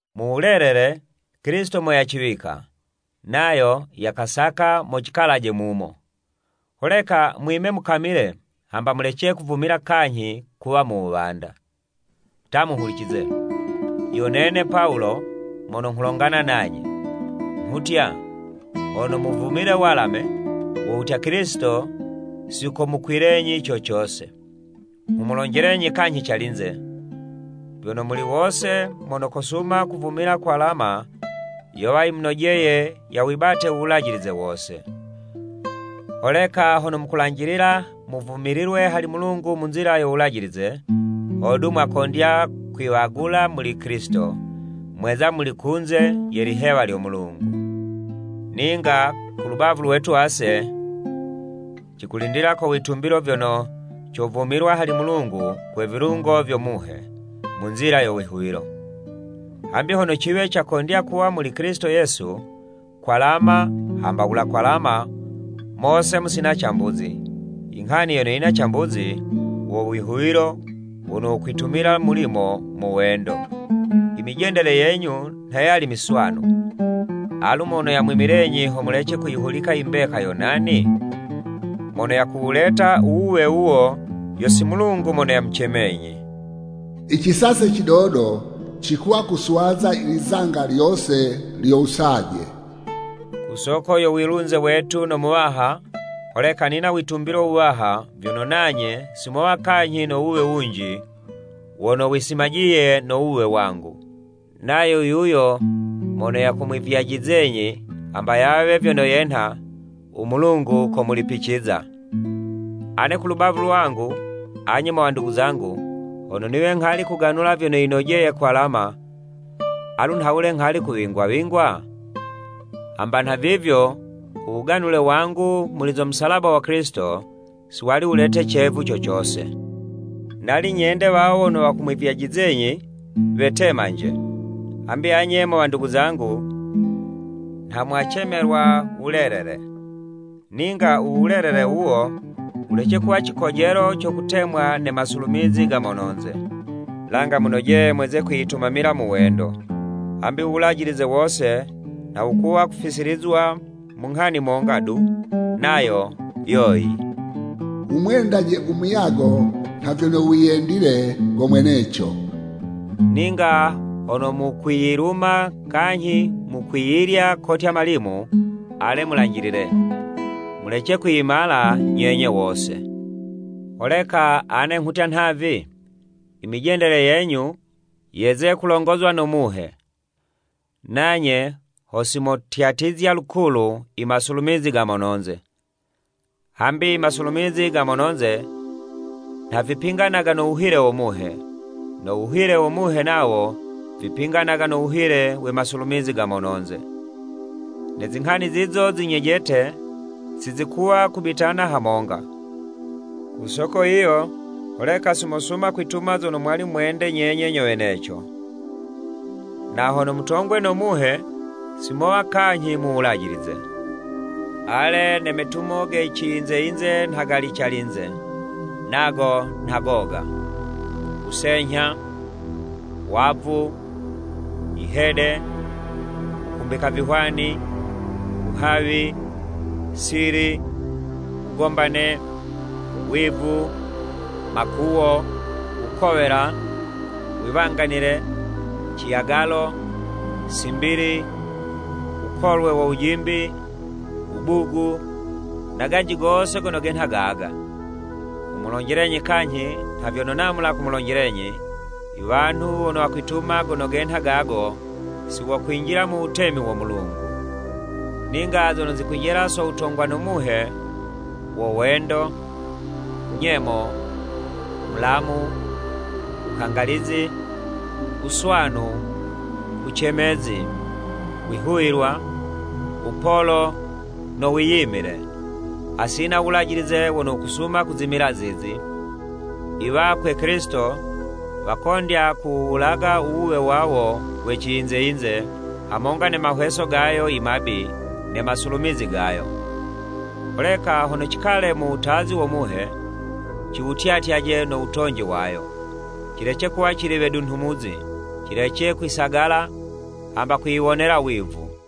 Mu wulelele, Kilisito mo yaciwika, nayo yakasaka mo cikalaje mumo. Holeka mwime mukamile hamba mulece kuvumila kanyhi kuwa mu wuwanda. Ta muhulicize! Yo nene Pawulo mono nghulongana nanye, nghutya, Hono muvumile walame, wo wutya, Kilisito si komukwilenyi co cose. Nghumulonjelenyi kanyhi calinze, vyono, muli wose mono kosuma kuvumila kwalama yowa yimunojeye yawibate u Wulajilize wose. Holeka hono mukulanjilila muvumililwe hali Mulungu mu nzila yo Wulajilize, hodu mwakondya kwiwagula muli Kilisito, mweza muli kunze ye lihewa lyo Mulungu. Ninga ku lubavu lwetu ase, cikulindila ko witumbilo vyono, covumilwa hali Mulungu kwe vilungo vyo Muhe, mu nzila yo wihuwilo. Hambi hono ciwe cakondya kuwa muli Kilisito Yesu, kwalama hamba wula kwalama, mose musina cambuzi, i nghani yono yina cambuzi, wo wihuwilo wono wukwitumila mulimo mu wendo. I mijendele yenyu nha yali miswanu, alu mono yamwimilenyi ho mulece kuyihulika i mbeka, yo nani? Mono yakuwuleta u wuwe wuwo, yo si Mulungu mono yamucemenyi. “I cisase cidodo cikuwa kuswaza lizanga lyose lyo wusaje.” Ku soko yo wilunze wetu no Muwaha, holeka nina witumbilo wuwaha vyono nanye si mowa kanyhi no wuwe wunji wono wisimajiye no wuwe wangu. Nayo yuyo mono yakumwivyajizenyi hamba yawe vyono yenha, u Mulungu komulipiciza. Ane ku lubavu lwangu, anye mo wandugu zangu, hono niwe nghali kuganula vyono yinojeye kwalama, alu nhawule nghali kuwingwa-wingwa? Hamba nhavivyo u wuganule wangu muli zo musalaba wa Kilisito, si wali wulete cevu co cose. Nali nyende wawo wono wakumwivyajizenyi, wetemanje. Hambi anye mo wandugu zangu, nha mwacemelwa wulelele. Ninga u wulelele wuwo wulece kuwa cikojelo co kutemwa ne masulumizi ga mononze. Langa munojeye mweze kwiyitumamila mu wendo. Hambi u Wulajilize wose nha wukuwa kufisilizwa mu nghani monga du, nayo yoyi, “Wumwendaje u muyago nha vyono wiyendile go mweneco.” Ninga hono mukwiyiluma kanyhi mukwiyilya kotya malimu, ale mulanjilile, mulece kwiyimala nyenye wose. Holeka ane nghutya nhavi, i mijendele yenyu yeze kulongozwa no Muhe, nanye ho si motyatizya lukulu i masulumizi ga mononze. Hambi i masulumizi ga mono'nze, nha vipinganaga no wuhile wo Muhe, no wuhile wo Muhe nawo, vipinganaga no wuhile we masulumizi ga mono'nze. Ne zinghani zizo zi nyejete si zikuwa kubitana hamonga, ku soko yiyo holeka si mosuma kwituma zono mwali mwende nyenye nyo weneco. Na hono mutongwe no Muhe, si mowa kanyhi mu Wulajilize. Ale, ne metumo ge ciyinze yinze nha gali calinze; nago nha goga, wusenyha, wavu, yihede, wukumbika vihwani, wuhawi, sili, wugombane, wivu, makuwo, wukowela, wiwanganile, ciyagalo, simbili, wukolwe wo wujimbi, wubugu, na ganji gose gono genha gaga. Nghumulonjelenyi kanyhi nha vyono namula kumulonjelenyi, i wanhu wono wakwituma gono genha gago, si wokwinjila mu wutemi wo Mulungu. Ninga zono zikwijela so wutongwa no Muhe, wo wendo, nyemo, mulamu, wukangalizi, wuswanu, wucemezi, wihuwilwa, wupolo no wiyimile. Hasina u Wulajilize wono wukusuma kuzimila zizi. I wakwe Kilisito, wakondya kuwuwulaga u wuwe wawo we ciyinze-yinze hamonga ne mahweso gayo i mabi ne masulumizi gayo. Holeka hono cikale mu wutazi wo Muhe, ciwutyatyaje no wutonji wayo. Cilece kuwa cili wedunhumuzi, cilece kwisagala, hamba kwiyiwonela wivu.